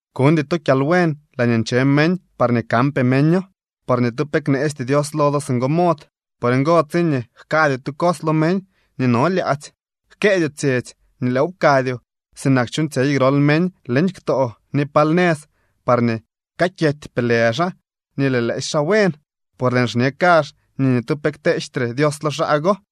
’Kuñdy to kyalbuen laañee nche meñ parñee kanpee meño. Por ni tu pe kneesty Dios lo do singo mod. Por ngo, tsiñee jkadyoo tu cos lo meñ nii no lyaadzy, jkëëdyoo tsyetsy nii lëëw pkadyoo, sinak chuuñtsyey grol meñ leñ ktoo ni pal nëz parñee kakyetypee lë xaa nii lëë lëësy xaa buen. Por lëën xñe kazh nii ni tu pe kteejtre Dios lo xaa go.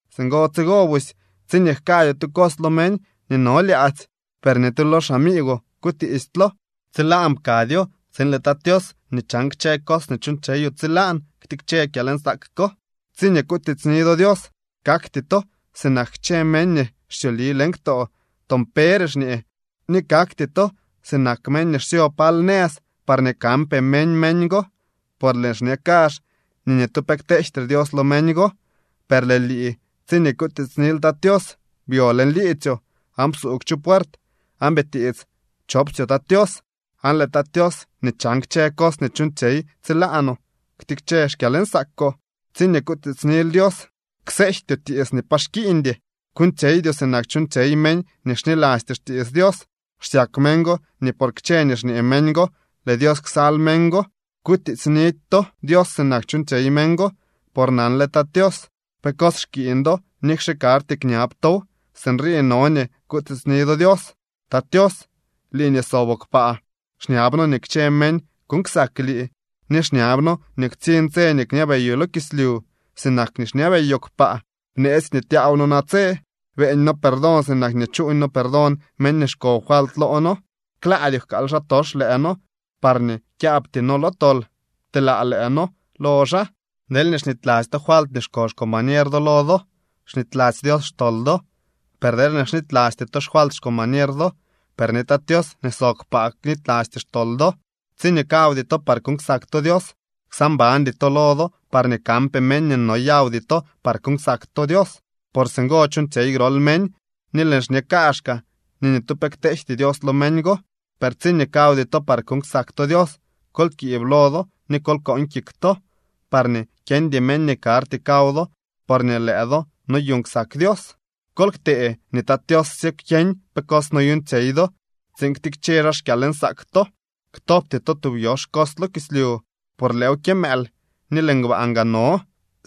Singo tsigo busy tsiñee jkadyoo tu cos lo meñ nii no lyaadzy, per ni tu lo xamiigwoo kutiistylo. Tsilaan pkadyoo tsiin lëë Tat Tios nii chan kchë cos nii chuuñtsyeyoo tsilaan ktikche kyalnsaak ko. ’Tsiñee kutiitsni do Dios, kaktyoo sinak kchë meñ nii xsyoli leñ ktoo toon pere xñee, ni kakty to sinak meñ nii xsyo pal nëz parñee kanpee meñ meñ go. Por lëën xñe kazh nii ni tu pe kteejtre Dios lo meñ go. Per lëë lii tsiñee kutiitsnil Tat Tios, byo leñ liidzyoo aan psuugw chu puert aan bitiits chopsyoo Tat Tios. Aan lëë Tat Tios nii chan kchë cos nii chuuñtsyey tsilaanoo ktikche xkyalnsaakoo. ’Tsiñee kutiitsnil Dios, kseejtyoo tiits nii pa xkiiñdy. Kuuñtsyeydyoo sinak chuuñtsyey meñ nii xnilasty xtiits Dios. Xsyak meñ go nii por kchë nii xñee meñ go lëë Dios ksal meñ go. Kutiitsnidy to Dios sinak chuñ meñ go, por nanle Tat Tios pe cos xkiiñ do nikxe karty kñab tow. Sinrii no nii kutiitsni do Dios: Tat Tios, lii nii soboo kpaa, xñab noo nii kchë meñ kuuñ ksak lii. Ni xñab noo nii ktsiñ tse nii kñabeyoo lo kislyu sinak nii xñabeyoo kpaa. Bneetsy nii tyaaw noo natse. Beeñ noo perdón sinak nii chuuñ noo perdón meñ nii xko falt loo noo. Klaadyoo jkaal xaatox lëë noo parñee kyaabty noo lo tol. Pteelaa lëë noo lo xaa. ’Deelñee xnityladzy to falt nii xko xcombañer do lo do, snityladzy Dios xtol do. Per deelñee knitylasty to xfalt xcombañer do, per ni Tat Tios nii sob kpaa knitylasty xtol do. ’Tsiñee kawdy to par kuuñ ksak to Dios, ksaa mbandy to lo do parñee kanpee meñ nii noyawdy to par kuuñ ksak to Dios. Por singo chuuñtsyey grol meñ ni lëën xñe kaazhkaa nii ni tu pe kteejty Dios lo meñ go. Per tsiñee kawdy to par kuuñ ksak to Dios, kol kiib lo do ni kol kooñ kik to parñee kyeñdy meñ nii karty kaw do porñee lëë do noyuuñ ksak Dios. Kol ktee nii Tat Tios sye kyeñ pe cos noyuuñtsyey do tsiin ktikche xaa xkyalnsaak to. ’Ktobty to tub yox cos lo kislyu, por lëëw kyëmëël ni lëë ngbaan gaa no.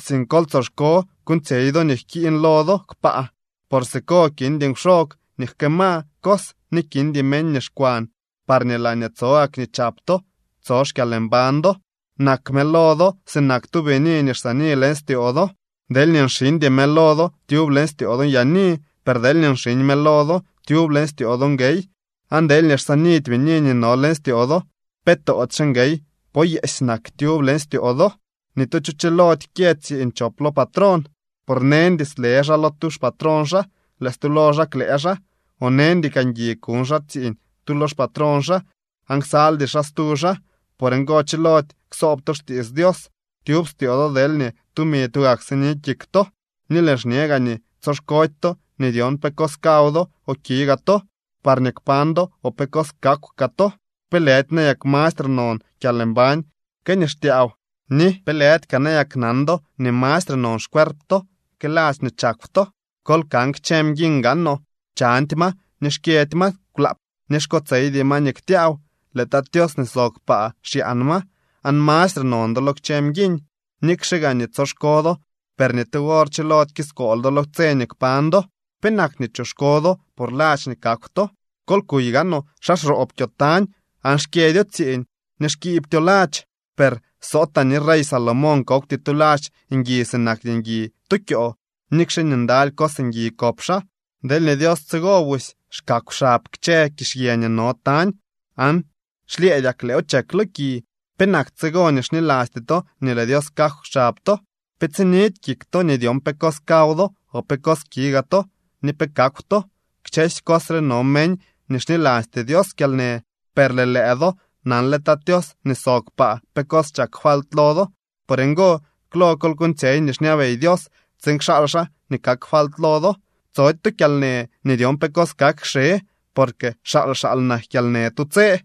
Sink kol tsoxko kuuñtsyey do nii jkiiñ lo do kpaa, por siko kindy nkwxog nii jkëëma cos ni kindy meñ nii xkwan. Parñee laañee tso gak nii chap to tso xkyalmbañ do. ’Nak mëlo do sinak tu bini nii xsaani leñ styoo do. Deelñee nxiñdy mëlo do tyub leñ styoo do nyaani. Per deelñee nxiñ mëlo do, tyub leñ styoo do nguey. Aan deelñee xsaanidy bini nii no leñ styoo do, ¿pe toodyxe nguey poo yeesy nak tyub leñ styoo do? ’Ni tu cho chilody kyë tsiiñ chop lo patrón. Por neñdy sle xaa lo tu xpatrón xaa, lëë stu lo xaa klëë xaa, o neñdy kaa ngui kuñ xaa xtsiiñ tu lo xpatrón xaa, aan ksaldy xaa stu xaa. Por ngo chilody ksoob to xtiits Dios tyub styoo do deelñee tumi tugak sini kik to. ’Ni lëën xñe gaa nii tsoxkody to nii dyon pe cos kaw do o ki gaa to parñee kpañ do o pe cos kakw kaa to. ¿Pe lëdy nayak mastre non kyalmbañ que nii xtyaaw, ni pe lëdy kaa nayaknan do nii mastre non xcuerp to que ladx nii chakw to? Kol kan kchë mguiñ gaanoo. Chandy ma ni xkyëdy ma kwlaap, ni xkotseydy ma nii ktyaaw. Lëë Tat Tios nii sob kpaa xyaan ma. ¡Aan mastre non do lo kchë mguiñ! Nikxe gaa nii tsoxko do, per ni tu wor chilody kiskool do lo tse nii kpañ do. ’¿Penak nii choxko do por ladx nii kakw to? Kol kuy gaanoo xa xroob kyoo tañ aan xkyëdyo tsiiñ ni xkibtyo ladx. Per sootaa ni rey Salomón kokwty tu ladx ngui sinak nii ngui tu kyoo, nikxe nii ndaly cos ngui kop xaa. Deelñee Dios tsigo busy xkakw xab kchë kizhyë nii no tañ aan xlyëëdyak lëëw chek lo ki, ¿penak tsigo nii xnilasty to nii lëë Dios jkakw xab to? Pe tsinidy kik to nii dyon pe cos kaw do o pe cos ki gaa to ni pe kakw to. Kchësy cos re no meñ nii xnilasty Dios kyalnë, per lëë lëë do nanle Tat Tios nii sob kpaa pe cos chak falt lo do. Por ngo, klo kol kuuñtsyey nii xñabey Dios tsiin kxaal xaa nii kak falt lo do. Tsody to kyalnë nii dyon pe cos kak kxe, porque xaal xaal nak kyalnë tu tse.